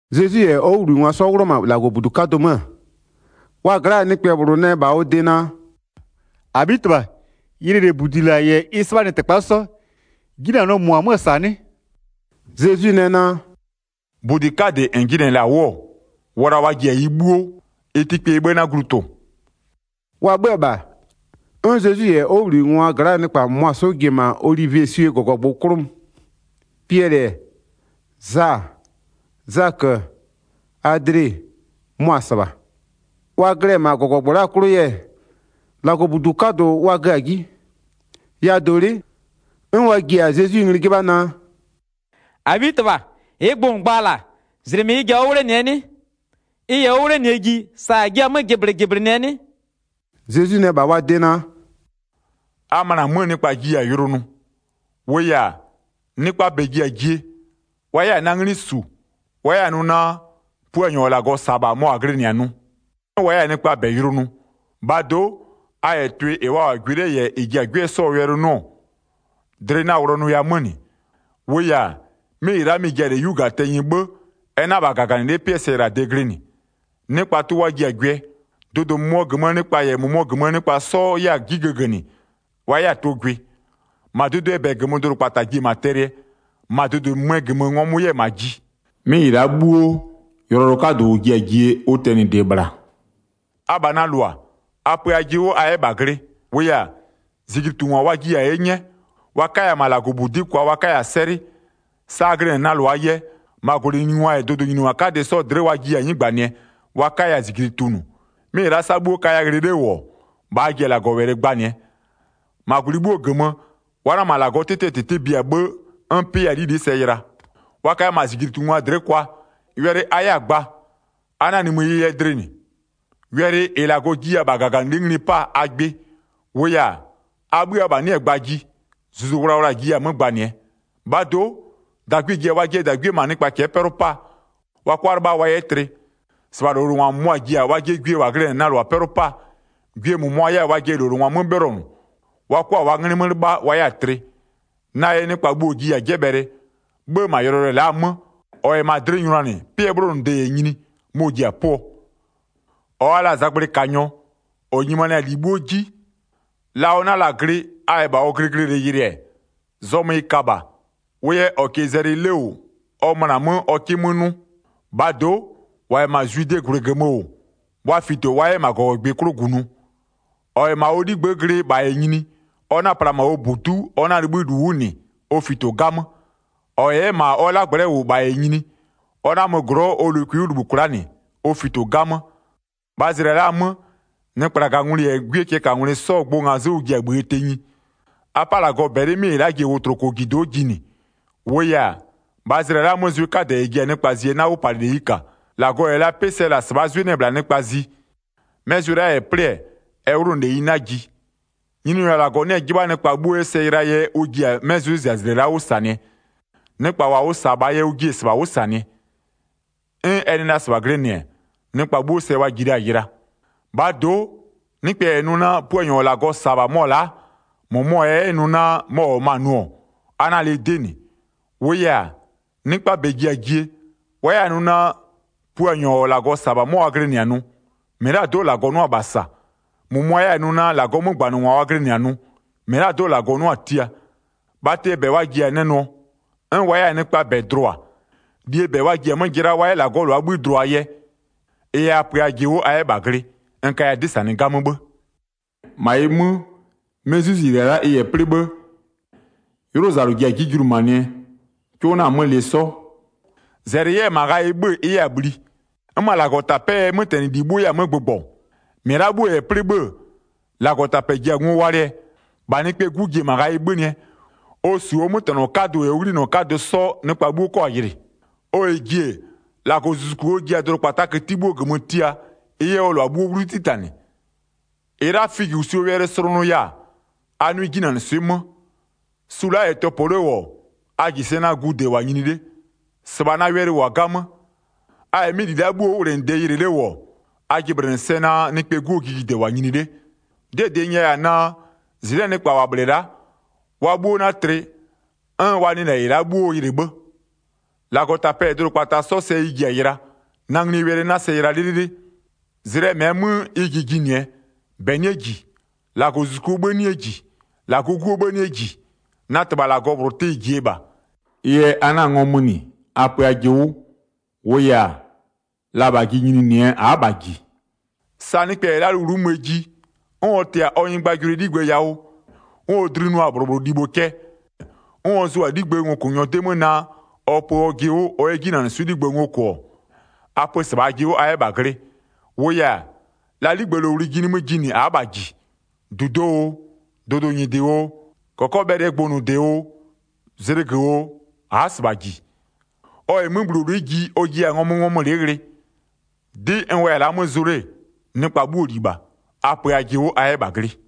Zezwi -yɛ ɔ 'wʋbhlinɩngwa 'sɔ 'wlʋ-ɔ -ma -Lagɔbudu 'kadʋ 'mö-ö, wa gla'aa nɩkpɛ -bhlʋ nɛ -bha ɔ de naa: “-Abhitɩbha, yɩlɩ -lɛ -budi -la -yɛ ɩ 'sɩbhanɩtɩkpa 'sɔ, 'jinanɔɔ -mʋ-ɔ 'mö-ö -sa 'nɩ?” Zezwi nɛ naa: “-Budi 'kadɩ -n jɩnɩ-ɛ -la 'wʋ-ɔ, wla wa ji-a ɩ 'bhuo, ɩ tɩkpeyie 'bhë 'na glu tʋ-ʋ.” Wa 'bhö-ö -bha, 'n Zezwi -yɛ ɔ 'wʋbhlinɩngwa gla'aa nɩkpa -mʋna 'sɔ ji-e -ma olivieswie -gɔgɔgbʋ 'klʋ mö. Piɛlɩ-ɛ, Za-a, Zakö-ö, Adle-e, mʋa-a -sɩbha. Wa glɩ-ɛ -ma -gɔgɔgbʋ la'a 'klʋ yɛ, -Lagɔbudu 'kadʋ wa gö-a 'ji. Yawʋdolɩ'ɩ, 'n wa ji-a Zezwi ngli 'jɩbha, naa: “-Abhitɩbha, -ɩɩ gbʋ -n gba-a -la, -zlɩmɩ ɩ ji-a 'wʋ 'wlenɩɛ 'nɩ? Ɩ -yɛ 'wʋ 'wlenɩɛ ji sa -a jiɩ-a 'mö jɩblɩjɩblɩnɩɛ 'nɩ?” Zezwi nɛ -bha wa de naa: “A möna 'mö, nɩkpa jiya-a yʋlʋ nʋ. 6-Wʋʋ yɛ-a, nɩkpaa -bɛ ji-a jie, wa 'yɛ-a na 'nglɩ -su, wa 'yɛ-a nʋ naa, Puanyɔ -ɔ -Lagɔ -sa-a -bha 'mɔ wa glɩnɩ-a nʋ. 'N wa 'yɛ-a nɩkpaa -bɛ yʋlʋ nʋ. 7-Bhaa do'o, a -yɛ tʋɩ -ɩ wa -wʋ-a gwɩ 'le -yɛ -ɩ ji-a 'gwɩɔ 'sɔɔ wɛlɩ 'nʋ-ɔ, dlɩ 'na-a wlɔnʋya 'mö -nɩ. -Wʋʋ yɛ-a, 'mɩ -ɩ la'a mɩ-ɩ ji-a -lɛ 'yu -gaa tɛnyɩ 'bhë, ɛ 'na -bha -gaganɩlɩ'ɩ 'pɩɛ sɛyɩlade glɩnɩ. Nɩkpa tʋ wa ji-a gwɩɛ, dʋdʋ -mʋmʋɔ -gömöö nɩkpa -yɛ -mʋmʋɔ -gömöö nɩkpa 'sɔ 'yɛ-a 'ji gëgënɩ, wa 'yɛ-a tʋ gwɩ. -Ma dʋdʋɩɛ -bɛ -gömö dʋdʋkpata ji-e -ma tɛlɩɛ, -ma dʋdʋɩ -mɩmɩɛ -gömö ngɔmʋ 'yɛ-a -ma ji. 'Mɩ -ɩ la'a 'bhuo, yʋlɔyʋlʋ 'kadʋ -ʋ ji-a jie ʋ tɛnɩde -bhla. Abha na -lʋa, a pö ajɩ 'wʋ a 'yɛ -bha glɩ. -Wʋʋ yɛ-a, -zijlitungwa wa jiya-a 'ye 'nyɛɛ, wa 'kaya-a -ma -Lagɔbudi'i kwa wa 'kaya-a 'sɛlɩ. Sa a glɩnɩ-ɛ na -lʋaa yɛ, -ma -gwlɩnyiningwa -yɛ dʋdʋnyiningwa 'kadɩ 'sɔ dlɩ'ɩ wa jiya-a 'nɩgbanɩɛ, wa 'kaya-a -zijli tunʋ. 'Mɩ -ɩ la'a sa'a 'bhuo kaya ghlɩ 'le -wʋ-ɔ, -bha a ji-a -Lagɔwɛlɩ gbanɩɛ. 10-Ma -gwlɩ 'bhuo -gömö, wa 'na -ma -Lagɔɔ 'tɩtɩɛ -tɩtɩ bia 'bhë, 'n 'pɩ 'yɛ-a 'lili'i sɛ yɩla. Wa kaya -ma -zijlitungwa dlɩ'ɩ kwa, wɛlɩ a 'yɛ-a gba, a 'na-a nimï ɩ yɛ dlɩ -nɩ, wɛlɩ -ɩ -Lagɔ jiya-a -bha -gaganɩlɩ'ɩ ngli 'paa a gbɩ. -Wʋʋ yɛ-a, a 'bhï abha 'nɩ-ɛ gbaa ji, Zuzu Wlawla-a jiya-a 'mö gbanɩɛ. 12-Bhaa do'o, -dagwie ji-a wajɩɛ -dagwie -ma nɩkpa cɛ'ɛ 'pɛlʋ 'paa, wa 'kʋa 'lɩbha wa 'yɛ tlɩ. -Sɩbha -lowlengwa -mʋmʋa ji-a wajɩɛ gwie -wa glɩnɩ-ɛ na -lʋa 'pɛlʋ 'paa. Gwie -mʋmʋa 'yɛ 'yɛ-a wajɩɛ -lowlengwa 'mö 'bhɩlɔnʋ, wa 'kʋa-a wa 'nglɩ 'mö 'lɩbha, wa 'yɛ-a tlɩ. Na yɛ nɩkpa 'bhuo jiya-a 'jɛbhɛlɩɛ. 'Bhë -ma yʋlɔyʋlʋɛ la'a 'mö, -ɔ -yɛ -ma dlɩ nyʋnanɩ, 'pɩɛ 'bhlonʋde -yɛ nyini, mɔ-ɔ ji-a 'pʋɔ. Zezwi yɛ yʋlɔyʋlʋɛ -ɛ ji-a jiee gbʋ gba 14-Ɔ wa la-a zagblɩkanyɔ, -ɔ nyimanɩ-a -li 'bhuo 'ji, la ɔ 'na la-a glɩ, a -yɛ -bha ɔ glɩglɩlɩ yɩlɩ-ɛ, zɔmö ɩ ka -bha, wʋ yɛ -ɔ -kɩɩ zɛlɩ 'le -wʋ ɔ möna-a 'mö ɔ 'kɩ 'mö 'nʋ. -Bhaa do'o, -wa -yɛ -ma Zwidee -gwlɩ -gömö -wʋ, wa fito wa 'yɛ -ma -gɔgɔgbɩ 'klʋ -gunʋ. 15-Ɔ -yɛ -bha ɔ 'ligbë'ë glɩ -bha -yɛ nyini, ɔ 'na-a pla -ma ɔ -budu'u, ɔ 'na-a 'libhï ɔ -li 'wʋ -nɩ, ɔ fito 'gamö. 16-Ɔ -yɛ 'yɛ -ma ɔ 'lagblɛ'ɛ -wʋ -bha -yɛ nyini, ɔ 'na-a mö -ma glɔ'ɔ ɔ lokwi 'wʋ -libhï kwla'a -nɩ, ɔ fito 'gamö. 17-Bhaa zlɩa la'a 'mö, nɩkplagangwlɩ -yɛ 'gwiee cɛɛkangwlɩ 'sɔɔ gbʋ ngazɩ'ɩ ʋ ji-a -bhïë tenyi. 18A 'pa -Lagɔ -bɛlɩ 'mɩ -ɩ la'a ji-e wotlokojido'o jinɩ. 19-Wʋʋ yɛ-a, -bhaa zlɩa la'aa 'mö, zwɩ 'kadɛ -ɛ ji-a nɩkpa zie 'na 'wʋpalɩleyi -ka. -Lagɔ -yɛ la 'pɩ sɛ -la -sɩbhaa 'zwɩ 'nɩ-ɛ -bhla nɩkpa zi. 'Mɛ zwɩ la'a -yɛ 'plɩ-ɛ, ɛ 'wlʋnʋleyi 'na ji. 20Nyininyɔ -Lagɔ 'nɩ-ɛ 'jɩbha nɩkpa 'bhuo 'yɛ sɛ yɩlaa yɛ ʋ ji-a 'mɩ 'zwɩzizlɩa la'a 'wʋ -sanɩɛ. Nɩkpa ʋ -sa-a -bhaa yɛ ʋ jiɩ-e -sɩbha 'wʋ -sanɩɛ. 'N ɛ nɩ la -sɩbha glɩnɩ-ɛ, nɩkpa 'bhuo sɛ wa 'jɩla yɩla. 21-Bhaa do'o, nɩkpɛ -yɛ nʋ naa, Puanyɔ -ɔ -Lagɔ -sa-a -bha mɔ-ɔ la'a, -mʋmɔ -yɛ 'yɛ nʋ naa, mɔ-ɔ -wʋ-ɔ -ma nʋ-ɔ, a 'na-a lɩ 'dɩ -nɩ. 22-Wʋʋ yɛ-a, nɩkpaa -bɛ ji-a jie, wa 'yɛ-a nʋ naa, Puanyɔ -ɔ -Lagɔ -sa-a -bha 'mɔ wa glɩnɩ-a nʋ, -mɩlado'o -Lagɔ 'nʋa-a -bha -sa. -Mʋmʋa 'yɛ-a nʋ naa -Lagɔɔ 'mögbanɩngwa wa glɩnɩ -bha nʋ, -mɩlado'o -Lagɔ 'nʋa-a tia. Bhatɩɛ -bɛ wa ji-a nɛ nʋɔ, 'n wa 'yɛ-a nɩkpaa -bɛ dlʋa. -Lie -bɛ wa ji-a 'mö jɩlaa wa 'yɛ -Lagɔɔ -lʋaa 'bhï dlʋaa yɛ. 23Ɩ yɛ a pö ajɩ 'wʋ a 'yɛ -bha glɩ, n kaya 'dɩ -sanɩ 'gamö 'bhë. Zezwi yɛ ɔ nimïjigbʋ gba 24-Ma ɩ 'mö, 'mɩ 'zwɩziylɩ-a la'a ɩ -yɛ 'plɩ 'bhë, 'ylʋzalʋ ji-a 'ji julumanɩɛ, 'cʋ 'na-a 'mö lɩ 'sɔ. 25-Zɛlɩ 'yɛ-ɛ -ma ghayɩ 'bhö-ö ɩ 'yɛ-a bhli. 'N -ma -Lagɔtapɛ'ɛɛ 'mötɛnɩli 'bhuo 'yɛ-a 'mö gbʋgbɔ. 26-Mɩ la'a 'bhuo -yɛ 'plɩ 'bhë-ë, -Lagɔtapɛ ji-a ngo walɩɛ, -bha Nɩkpɛɛ 'Gu ji-e -ma ghayɩ 'bhönɩɛ, ɔ -su ɔ 'mötɛnɔ 'kadʋ -yɛ ɔ 'ghlinɔ 'kadʋ 'sɔ, nɩkpa 'bhuo 'kɔ-a yɩlɩ. 27Ɔ -yɛ ji-e, -Lagɔzuzuku ɔ ji-a dʋdʋkpataa këti 'bhuoo -gömö tia, ɩ 'yɛ ɔ -lʋa 'bhuo 'wlu 'titanɩ. Zezwi yɛ figösuo 'ji palɩ 28-Ɩ la'a figösuo wɛlɩ slʋnʋya-a, a 'nʋɩ 'jinanɩswɩ'ɩ 'mö. Su la'a -yɛ tɔpɔ 'le -wʋ-ɔ, a -ji sɛ naa gude -wʋ-a nyini 'le. 29-Sɩbha na wɛlɩ -wʋ-a 'gamö. A -yɛ 'mɩ -li la'a 'bhuoo 'wʋwlenɩde yɩlɩ 'le -wʋ-ɔ, a jɩblɩnɩ sɛ naa, Nɩkpɛɛ 'Guo jijide -wʋ-a nyini 'le. 30'Dɩɛ -dɩ n nyɛya-a naa, -zɩnɩ'ɩɛ nɩkpa -wa -bhlɩ-ɛ la'a, wa 'bhuo 'na tlɩ, 'n wa nɩ -lɛ -ɩ la'a 'bhuo yɩlɩ 'bhë. 31-Lagɔtapɛ -yɛ dʋdʋkpata 'sɔ sɛ ɩ ji-a yɩla, na nglie wɛlɩ 'na sɛ yɩla 'lɩlɩlɩ. 32Zlɩɛ -mɛɛ 'mö ɩ ji jinɩɛ, -bɛ 'nɩɛ -ji, -Lagɔzuzukuo 'bhï 'nɩɛ -ji, -Lagɔɔ 'Guo 'bhë 'nɩɛ -ji. Na -Tɩbha -Lagɔ -bhlʋ tɩ-ɩ -jie -bha. 33Ɩ yɛ a 'na-a ngɔmö -nɩ, a pö ajɩ 'wʋ. -Wʋʋ yɛ-a, la -bha ji nyininɩɛ a'a -bha -ji. 34Sa nɩkpɛ -yɛ la'a lowlu'u möö ji, 'n ɔ tɩ-a ɔ nyɩgbajʋlʋɩ ɔ 'ligbë yawʋ, 'n ɔ dlinʋa-a -bhlʋ -bhlʋ libho cɛ, 'n ɔ zʋ-a 'ligbëë ngokʋnyɔ 'dɩ 'mö naa, ɔ pö ɔjɩ 'wʋ ɔ 'yɛ 'jinanɩswɩ'ɩ 'ligbë ngo -kʋ-ɔ, 35a pö -sɩbha ajɩ 'wʋ a 'yɛ -bha glɩ. -Wʋʋ yɛ-a, la 'ligbëlowli ji nimï jinɩɛ a'a -bha -ji. -Dudoo oo, dʋdʋnyɩdɩ oo, -kɔkɔbhɛlɩɛ gbʋnʋde oo, zlɩgö oo, a'a -sɩbha -ji. 36Ɔ -yɛ 'möbhulolɩ'ɩ ji ɔ jiya-a ngɔmöngɔmölɩ'ɩ ghlɩ. 37'Dɩ n wʋya-a la'a 'mö zʋ 'le, nɩkpa 'bhuoo -li -bha. A pö ajɩ 'wʋ a 'yɛ -bha glɩ.”